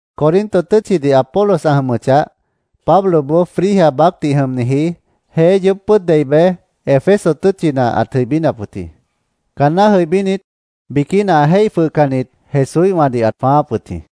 Corinto tʉ́tchidih Apolos ã jʉmʉchah, Pabloboó Frigia baácdih jʉmniji jeé yoób pʉ́ʉd dei bej, Éfeso tʉ́tchina ãt jʉibínap wʉt jĩ. Caanná jʉibínit, biquína ã jéih jwʉhcannit Jesúíhwãdih ãt jwãááp wʉt jĩ.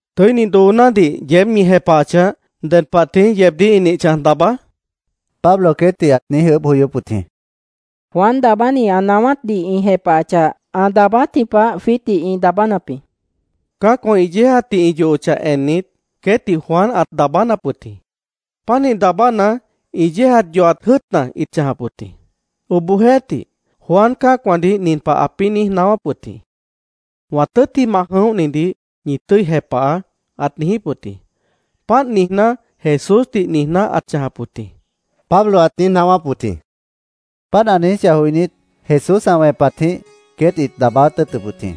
—¿Tʉ́ini doonádih yeéb ñi jepahachah, ded pah tií yeebdíh ĩ nih chãj daabá? Pablo queétdih ãt niíj ʉʉ́bh joyóp wʉt jĩ. —Juan Daabáni ã naáwátdih ĩ jepahachah, ã daabáátji pah jwiítdih ĩ daabánap jĩ, ĩt niíj jepahap wʉt jĩ. —Cã́acwã ĩ yéejatdih ĩ yohochah ennit, queétdih Juan ãt daabánap wʉt jĩ. Pánih daabána, ĩ yéejat yohat jʉ́ʉtna ĩ chãjap wʉt jĩ. Obohjeéhtih, Juan cã́acwãdih nin pah ãpĩ́ niíj naáwáp wʉt jĩ. ‘Wã tʉ́ttimah jʉ̃óhnidih ñi tʉ́i jepahaá’, ãt niijíp wʉt jĩ. Páant niijná, Jesúsdih niijná ãt chãjap wʉt jĩ, Pablo ãt niíj naáwáp wʉt jĩ. Páant ã niijíchah joinít, Jesús ã wẽpatjĩh queét ĩt daabáát tʉ́ʉtʉp wʉt jĩ.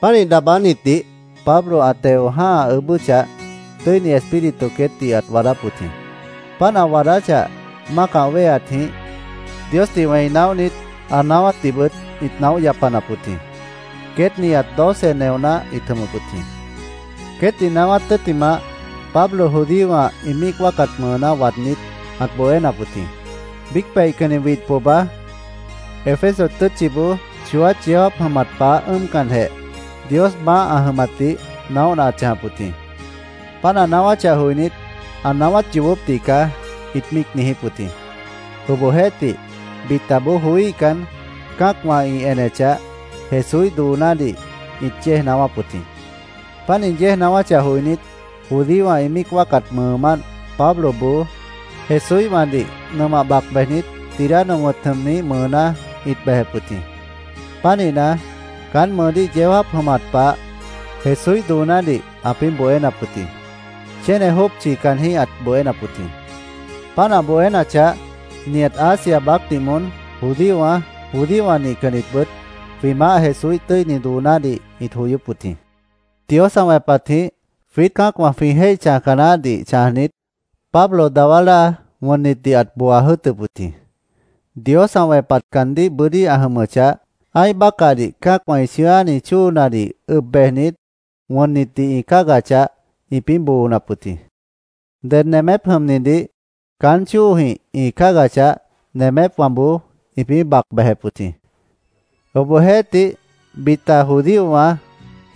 Pánih daabánitdih Pablo ã teo jã́ha ʉʉ́bʉ́chah, Tʉ́ini Espíritu queétdih ãt waadáp wʉt jĩ. Páant ã waadáchah, mácah wéheatjĩh Diosdih wẽi naóhnit, ã naáwátdihbʉt ĩt naóh yapanap wʉt jĩ. Queét nihat doce neoná ĩt jʉmʉp wʉt jĩ. Queétdih naáwát tʉ́ttimah, Pablo judíowã ĩ míic wáacat mʉʉná waadnít, ãt bohénap wʉt jĩ. Biíc peihcanni widh pohba Éfeso tʉ́tchiboó chooát yeó jáap jʉmat pah ʉ́ʉmcanjeh, Dios maáh ã jʉmatdih naóhna ãt chãjap wʉt jĩ. Páant ã naáwáchah joinít, “Ã naáwát yoobópdih caá”, ĩt míic niijíp wʉt jĩ. Obohjeéhtih, bitaboó joííhcan, cã́acwã ĩ enechah, Jesúíh doonádih ĩt yéej naáwáp wʉt jĩ. Páant ĩ yéej naáwáchah joinít, judíowã ĩ míic wáacat mʉʉmánt Pabloboó Jesúíhwãdih nʉmah bac bejnit, Tirano wʉ̃t jʉmniíh mʉʉná ĩt bejep wʉt jĩ. Pánihna, caán mʉʉdíh yeó jáap jʉmat pah Jesúíh doonádih ãpĩ́ bohénap wʉt jĩ. Chéne jópchi caanjĩ́h ãt bohénap wʉt jĩ. Páant ã bohénachah, nihat Asia baácdih moón judíowã, judíowã nihcannitbʉt jwĩ Maáh Jesúíh tʉ́ini doonádih ĩt joyóp wʉt jĩ. Dios ã wẽpatjĩh jwiít cã́acwã jwĩ jéih chãjca naáhdih chãjnit, Pablo dawá láa wʉnnitdih ãt booa jʉ́ʉtʉp wʉt jĩ. Dios ã wẽpat caandíh bʉ́dí ã jʉmʉchah, ã́ih bácahdih cã́acwã ĩ chʉ̃ʉ́áni chóonadih ʉb bejnit, wʉnnitdih ĩ cáagachah, ĩpĩ́ boonap wʉt jĩ. Ded nemép jʉmnidih caán chóojĩh ĩ cáagachah, nemépwãboó ĩpĩ́ bac bejep wʉt jĩ. Obohjeéhtih, bita judíowã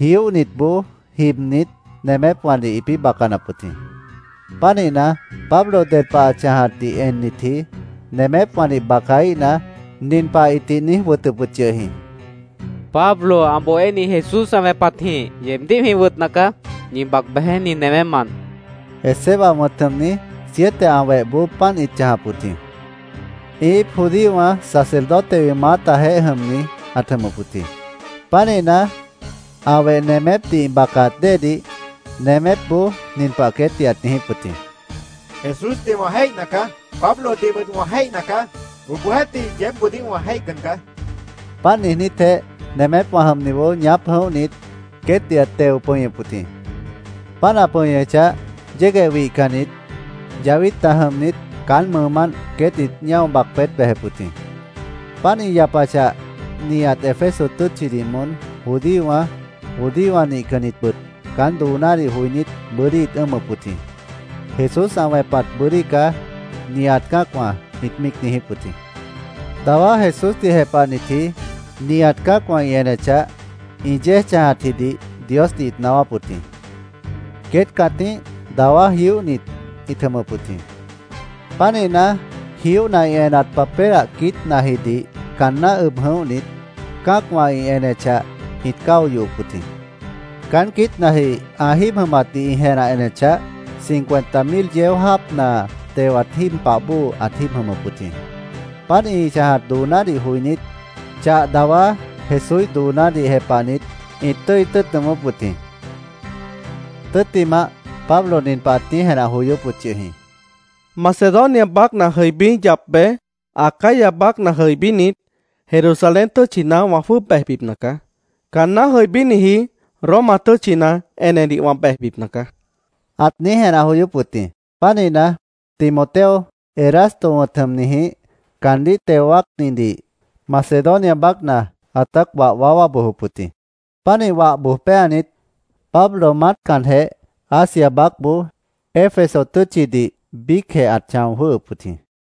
jióhnitboó jibnit, nemépwãdih ĩpĩ́ bacanap wʉt jĩ. Pánihna, Pablo ded pah ã chãjatdih ennitji nemépwãdih bacaíhna, nin pah ĩtih niíj wʉtʉp wʉt yʉh jĩ: “Pablo ã bohéni Jesús ã wẽpatjĩh yeebdíh jwĩ wʉtna caá. Ñi bac bejeé nin newémant”, ĩpĩ́ niijíp wʉt jĩ. Esceva wʉ̃t jʉmni, siete ã wehboó páant ĩt chãjap wʉt jĩ. Ĩ íip judíowã sacerdotewã ĩ maátajeéh jʉmni ãt jʉmʉp wʉt jĩ. Pánihna, ã weh nemépdih ĩ bacaat déedih, nemépboó nin pah queétdih ãt niijíp wʉt jĩ: “Jesúsdih wã jéihna caá. Pablodihbʉt wã jéihna caá. Obohjeéhtih, yeébboodíh wã jéihcan caá”, ãt niijíp wʉt jĩ. Páant niijnítjeh, nemép jʉmniboó ñaáp jʉ̃óhnit, queétdih ãt teo pʉñʉp wʉt jĩ. Páant ã pʉñʉchah, yégueh wihcannit, yahwítna jʉmnit, caán mʉʉmánt queét ĩt ñáo bac peét bejep wʉt jĩ. Páant ĩ yapachah, nihat Éfeso tʉ́tchidih moón, judíowã, judíowã nihcannitbʉt caán doonádih joinít, bʉ́dí ĩt ʉ́ʉmʉp wʉt jĩ. “Jesús ã wẽpat bʉ́dí caá”, nihat cã́acwã ĩt míic niijíp wʉt jĩ. Dawá Jesúsdih jepahnitji, nihat cã́acwã ĩ enechah, ĩ yéej chãjatjidih Diosdih ĩt naáwáp wʉt jĩ. Queét cãtíh dawá jióhnit ĩt jʉmʉp wʉt jĩ. Pánihna, jióhna ĩ enat papélah quiítnajidih caanná ʉb jʉ̃óhnit, cã́acwã ĩ enechah, ĩt cáo yohop wʉt jĩ. Caán quiítnaji ã jíib jʉmatdih ĩ jenah enechah, cincuenta mil yeó jáapna tewat jíib pah bóo ãt jíib jʉmʉp wʉt jĩ. Páant ĩ chãjat doonádih joinít, chah dawá Jesúíh doonádih jepahnit, ĩt tʉ́i tʉ́ʉt nʉʉmʉ́p wʉt jĩ. Tʉ́ttimah, Pablo nin pah ãt niíj jenah joyóp wʉt yʉh jĩ: “Macedonia baácna jʉibí yap bej, Acaya baácna jʉibínit, Jerusalén tʉ́tchina wã jwʉ́ʉb bejbipna caá. Caanná jʉibíniji Roma tʉ́tchina enedih wã bejbipna caá”, ãt niíj jenah joyóp wʉt jĩ. Pánihna, Timoteo, Erasto wʉ̃t jʉmnijĩh caandíh teo wáacnitdih Macedonia baácna ãtát wah waáwá bojop wʉt jĩ. Pánih wah boj péanit, Pablo maátcanjeh Asia baácboó, Éfeso tʉ́tchidih biícjeh ãt chão jwʉ́hʉp wʉt jĩ.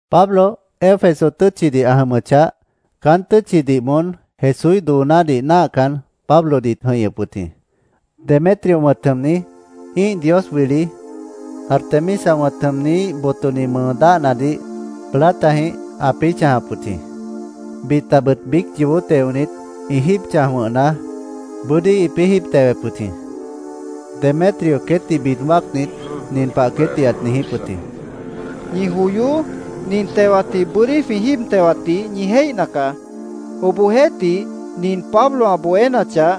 Pablo Éfeso tʉ́tchidih ã jʉmʉchah, caán tʉ́tchidih moón Jesúíh doonádih náahcan, Pablodih ĩt jʉ̃ihñʉp wʉt jĩ. Demetrio wʉ̃t jʉmni, ĩ́ih dios wili Artemisa wʉ̃t jʉmnihíh botoni mʉʉ dáhnadih platajĩh ãpĩ́ chãjap wʉt jĩ. Bitabʉt biíc yoobó teonit, ĩ jíib chãj wʉ̃hna, bʉ́dí ĩpĩ́ jíib tewep wʉt jĩ. Demetrio queétdih bid wáacnit, nin pah queétdih ãt niijíp wʉt jĩ: “Ñi joyoó. Nin tewatjĩh bʉ́dí jwĩ jíib tewatdih ñi jéihna caá. Obohjeéhtih, nin Pablo ã bohénachah,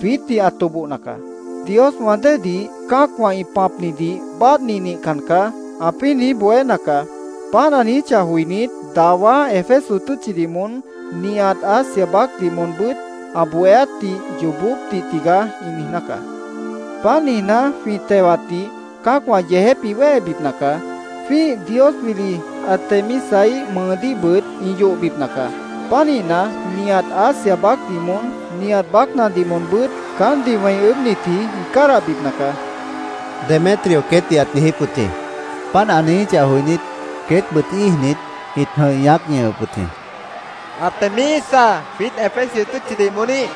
jwiítdih ã tobohna caá. ‘Dioswã déedih cã́acwã ĩ pãpnidih báadhni nihcan caá’, ãpĩ́ niíj bohéna caá. Páant ã niijíchah joinít, dawá Éfeso tʉ́tchidih moón, nihat Asia baácdih moonbʉ́t ã bohéátdih ‘Yoobópdih tigaá’, ĩ niijná caá. Páant niijná, jwĩ tewatdih cã́acwã yeejép ĩ wéhebipna caá. Jwĩ́ih dios wili Artemisaíh mʉʉdíhbʉt ĩ yohbipna caá. Pánihna, nihat Asia baácdih moón, nihat baácnadih moonbʉ́t caántdih wẽi ʉʉ́bhnitji ĩ cádahbipna caá”, Demetrio queétdih ãt niijíp wʉt jĩ. Páant ã niijíchah joinít, queétbʉt íijnit, ĩt jʉ̃ih ñaác ñʉhʉp wʉt jĩ: “Artemisa, jwiít Éfeso tʉ́tchidih moóníh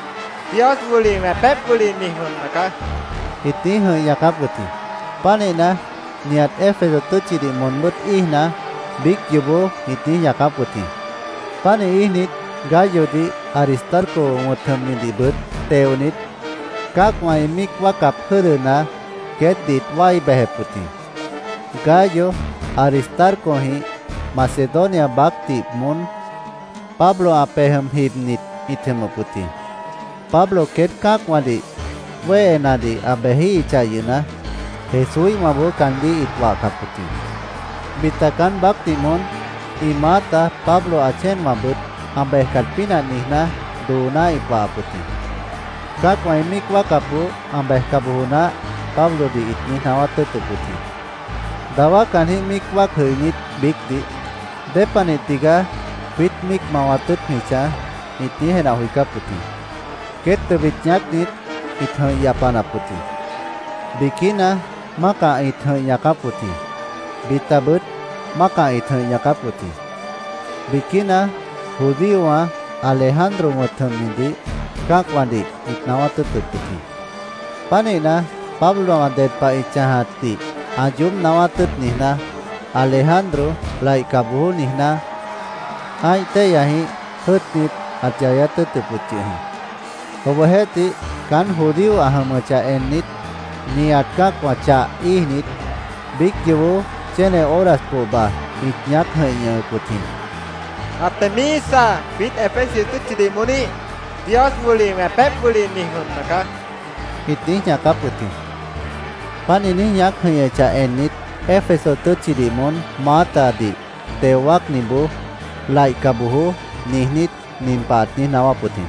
dios wili wẽpép wili mi jʉmna caá”, ĩt niíj jʉ̃ih ñaacáp wʉt jĩ. Pánihna, nihat Éfeso tʉ́tchidih moonbʉ́t íijna, biíc yoobó ĩt niíj ñaacáp wʉt jĩ. Pánih íijnit, Gayodih, Aristarco wʉ̃t jʉmnidihbʉt teonit, cã́acwã ĩ míic wáacap jʉ́dʉna queétdih ĩt wái bejep wʉt jĩ. Gayo, Aristarcojĩh Macedonia baácdih moón Pablo ã pej jʉm jibnit ĩt jʉmʉp wʉt jĩ. Pablo queét cã́acwãdih wéhenadih ã bejíhichah yʉhna, Jesúíhwãboó caandíh ĩt wahcap wʉt jĩ. Bita caán baácdih moón ĩ maáta Pablo ã chéenwãbʉt ã bejcat pínah niijná dooná ĩt wahap wʉt jĩ. “Cã́acwã ĩ míic wáacapboó ã bejca bojo naáh”, Pablodih ĩt niíj naáwát tʉ́ʉtʉp wʉt jĩ. Dawá caanjĩ́h míic wáac jʉinít biícdih “¿Dépanih tigaá jwiít míic mawat tʉ́ʉt jwĩ chãj?” ĩt niíj jenah joicáp wʉt jĩ. Queét tʉbit ñaácnit, ĩt jʉ̃ih yapanap wʉt jĩ. Biquína mácah ĩt jʉ̃ih ñaacáp wʉt jĩ. Bitabʉt mácah ĩt jʉ̃ih ñaacáp wʉt jĩ. Biquína judíowã Alejandro wʉ̃t jʉmnidih cã́acwãdih ĩt naáwát tʉ́ʉtʉp wʉt jĩ. Pánihna, Pablowã ded pah ĩ chãjatdih ã yoób naáwát tʉ́ʉt niijná, Alejandro “Laihca bojoó”, niijná, ã́ih téihyajĩh jʉ́ʉtnit, ãt yayát tʉ́ʉtʉp wʉt yʉh jĩ. Obohjeéhtih, caán judío ã jʉmʉchah ennit, nihat cã́acwã chah íijnit, biíc yoobó chéne horas pohba ĩt ñaác jʉ̃ih ñʉhʉp wʉt jĩ: “Artemisa, jwiít Éfeso tʉ́tchidih moóníh dios wili wẽpép wili mi jʉmna caá”, ĩt niíj ñaacáp wʉt jĩ. Páant ĩ niíj ñaác jʉ̃ihñʉchah ennit, Éfeso tʉ́tchidih moón maátadih teo wáacniboó, “Laihca bojoó” niijnít, nin pah ãt niíj naáwáp wʉt jĩ: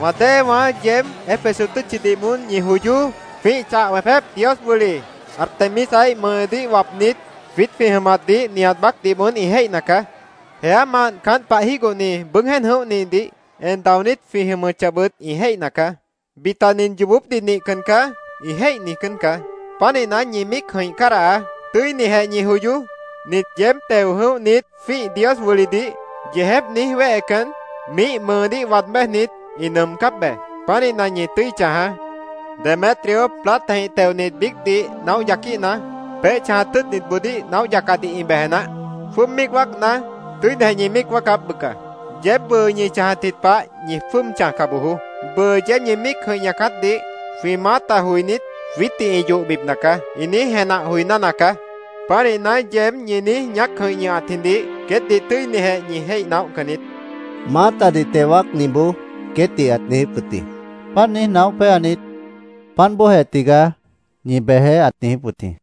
“Wã déewãá, yeéb Éfeso tʉ́tchidih moón, ñi joyoó. Jwĩ́ih chah wẽpép dios wili Artemisaíh mʉʉdíh wapnit jwiít jwĩ jʉmatdih nihat baácdih moón ĩ jéihna caá. Jeámant caánt pah jígohni bʉʉ́g jéen jʉ̃óhnidih en daonít jwĩ jʉmʉchahbʉt ĩ jéihna caá. Bita ‘Nin yoobópdih nihcan caá’, ĩ jéih niijcán caá. Pánihna, ñi míic jʉ̃ih cádahaá. Tʉ́inijeh ñi joyoó. Nit yeéb teo jʉ̃óhnit jwĩ́ih dios wilidih yeejép niíj wéhecan, miíh mʉʉdíh waad béjnit, ĩ nʉʉmcáp be. Pánihna, ñi tʉ́i chãjaá. Demetrio, platajĩh teonit biícdih naóh yaquíhna, peéh chãjat tʉ́ʉtnitboodíh naóh yacadih ĩ beje naáh. Jwʉ́ʉb míic wáacna, tʉ́inijeh ñi míic wáacáp, bʉca. Yeéb bʉʉ ñi chãjatji pah ñi jwʉ́ʉb chãjca bojoó. Bʉʉ yeéb ñi míic jʉ̃ih ñaacátdih jwĩ maáta joinít, ‘Jwiítdih ĩ yohbipna caá’, ĩ niíj jenah joiná nacaá. Pánihna, yeéb ñi niíj ñaác jʉ̃ih ñʉhatjidih queétdih tʉ́inijeh jwĩ jéih naóhcan niít”, maátadih teo wáacniboó queétdih ãt niijíp wʉt jĩ. Páant niíj naóh péanit, “Páant bóojeh tigaá. Ñi bejeé”, ãt niijíp wʉt jĩ.